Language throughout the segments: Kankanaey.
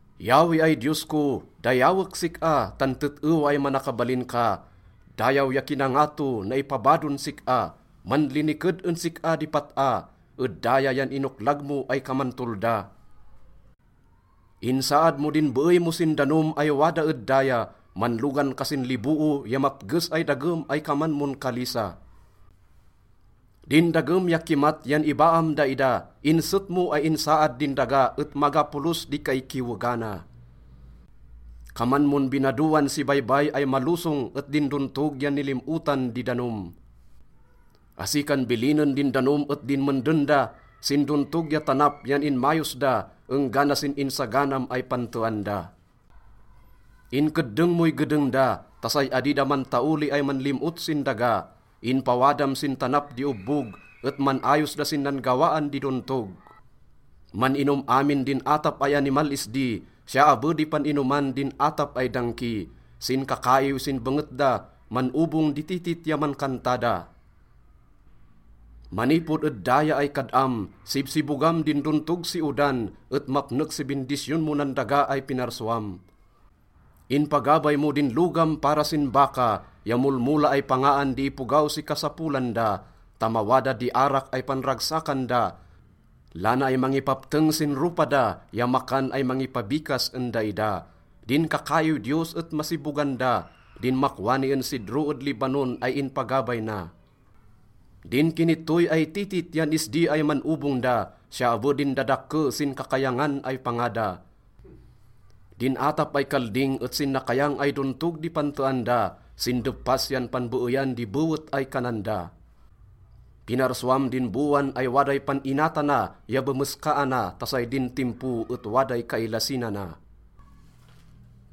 Yahweh ay Diyos ko, dayawek sik-a, tan tet-ewa ay manakabalin ka. Dayaw ya kinangato, naipabadon sik-a, manliniked en sik-a di pat-a. Ed daya yan inoklag mo ay kaman tolda. Insaad mo din beey mo sin danom ay wada ed daya. Manlogan ka sin liboo ya mapges ay dagem ay kaman mon kalisa. Din dagem ya kimat yan ibaam daida. Inset mo ay insaad din daga et maga polos di kaikiwegana. Kaman mon binadoan si baybay ay malosong et din dontog yan nilim-otan di danom. Asi kan bilinen din danom et dinmenden da. Sin dontog ya tanap yan inmayos da enggana sin insaganam ay pantean da. Inkeddeng moy gedeng da ta say adi da mantaoli ay manlim-ot sin daga. Inpawadam sin tanap di obbog, et man-ayos da sin nan-gawaan di dontog. Man-inom amin din atap ay animal isdi, siya abe di pan-inoman din atap ay dangki. Sin kakaiw sin benget da, man-obong di titit ya mankanta da. Manipod ed daya ay kad-am, sibsibogam din dontog si odan, et mapnek si bindisyon mo nan daga ay pinarsuam. Inpagabay mo din logam para sin baka ya molmola ay pangaan di ipogaw si kasapolan da, ta mawada di arak ay panragsakan da, lana ay mangipapteng sin ropa da, ya makan ay mangipabikas en daida. Din kakaiw Diyos et masibogan da, din makwani en sidro ed Lebanon ay inpagabay na. Din kinittoy ay titit yan isdi ay man-obong da, siya abe din dadakke sin kakayangan ay panga da. Din atap ay kalding et sin nakayang ay dontog di pantean da, sin deppas yan panbeeyan di bewet ay kanan da. Pinarsuam din bowan ay waday pan-inatana ya bemeskaana ta say din timpo et waday kailasinana.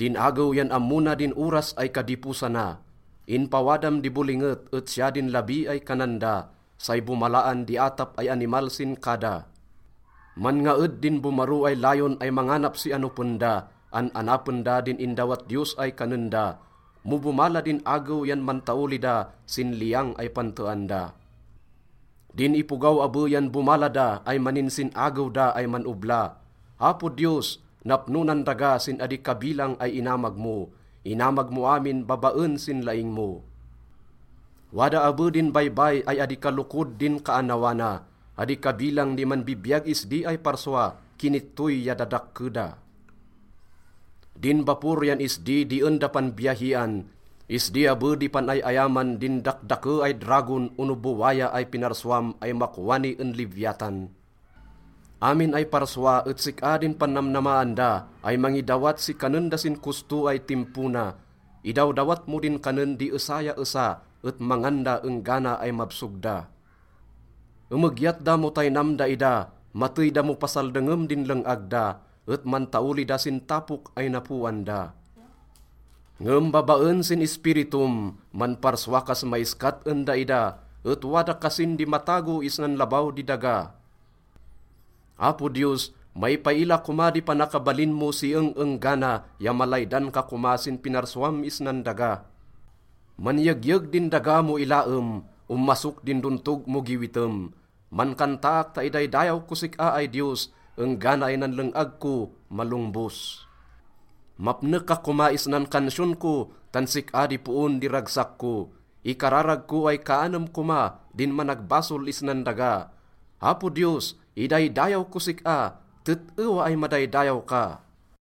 Din agew yan ammo na din oras ay kadiposana. Inpawadam di bolinget et siya din labi ay kanan da, say bomalaan di atap ay animal sin kada. Manngaed din bomaro ay layon ay manganap si anopen da, an-anapen da din indawat Diyos ay kanen da. Mo bomala din agew yan mantaoli da sin liyang ay pantean da. Din ipogaw abe yan bomala da ay maninsin-agew da ay man-obla. Apo Diyos, napno nan daga sin adi kabilang ay inamag mo. Inamag mo amin babaen sin laing mo. Wada abe din baybay ay adi kalokod din kaannawa na. Adi kabilang di manbibiyag isdi ay parsua, kinittoy ya dadakke da. Din bapor yan isdi di en da panbiyahian. Isdi abe di pan-ay-ayaman din dakdake ay dragon ono bowaya ay pinarsuam ay makwani en Leviatan. Amin ay parsua et sik-a din pannamnamaan da ay mangidawat si kanen da sin kosto ay timpo na. Idawdawat mo din kanen di esa ya esa, et mangan da enggana ay mabsog da. Emegyat da mo taynam daida. Matey da mo pasaldengem din leng-ag da et mantaoli da sin tapok ay napoan da. Ngem babaen sin Ispiritom, manparsua kas maiskat en daida, et wada kasin di matago isnan labaw di daga. Apo Diyos, maipaila koma di panakabalin mo si eng-enggana ya malaydan ka koma sin pinarsuam isnan daga. Manyegyeg din daga mo ilaem, omasok din dontog mo giwitem. Mankantaak ta idaydayaw kos sik-a ay Diyos enggana ay nan leng-ag ko, malongbos. Mapnek ka koma isnan kansiyon ko, tan sik-a di poon di ragsak ko. Ikararag ko ay kaanem koma din managbasol isnan daga. Apo Diyos, idaydayaw kos sik-a! Tet-ewa ay madaydayaw ka!